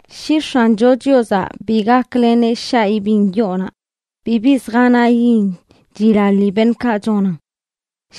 Shi X̱ancho Chiozaꞌ bi gakleneꞌ shaꞌ ibiṉ yoonaꞌ bibi zjanayin chilaḻi beṉꞌkaꞌ chonan.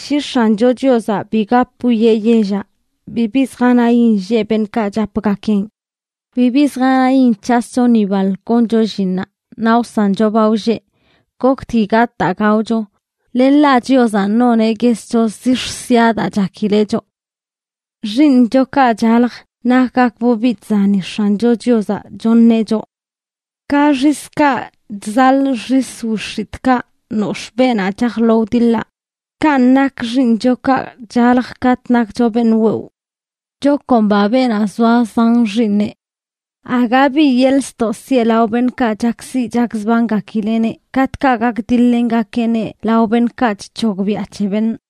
Shi X̱ancho Chiozaꞌ bi gap wiꞌe yellaꞌ, bibi zjanayin lleꞌ beṉꞌkaꞌ chapgakeꞌn. Bibi zjanayin c̱hascho ni baḻ goncho llinnaꞌ naꞌ wsancho ba wlleꞌ, goktgui gatꞌ daa gaocho, len ḻaꞌ Chiozaꞌ noneꞌ guescho zix̱ sia daa chakileꞌ choꞌ. Xiiṉchokaꞌ chalj nakgakbꞌ biꞌ chzani X̱ancho Chiozaꞌ choṉeꞌ choꞌ. Ka xiskaꞌ chzaḻꞌ xis wix̱itꞌkaꞌ nox̱ꞌ beenaꞌ chaj lo wdiḻaꞌ, kanꞌ nak xiiṉchokaꞌ chaljə katꞌ nakcho beṉꞌ wewꞌ. ¡Chakomba beenaꞌ zoa zan xiiṉeꞌ! Aga bi yeḻꞌ ztoꞌ siꞌe lao beṉꞌkaꞌ chakziꞌ chakzbangakileꞌneꞌ katꞌkaꞌ gakdiḻ-lengakeꞌneꞌ lao beṉꞌkaꞌ chc̱hogbiaꞌ c̱he beṉꞌ.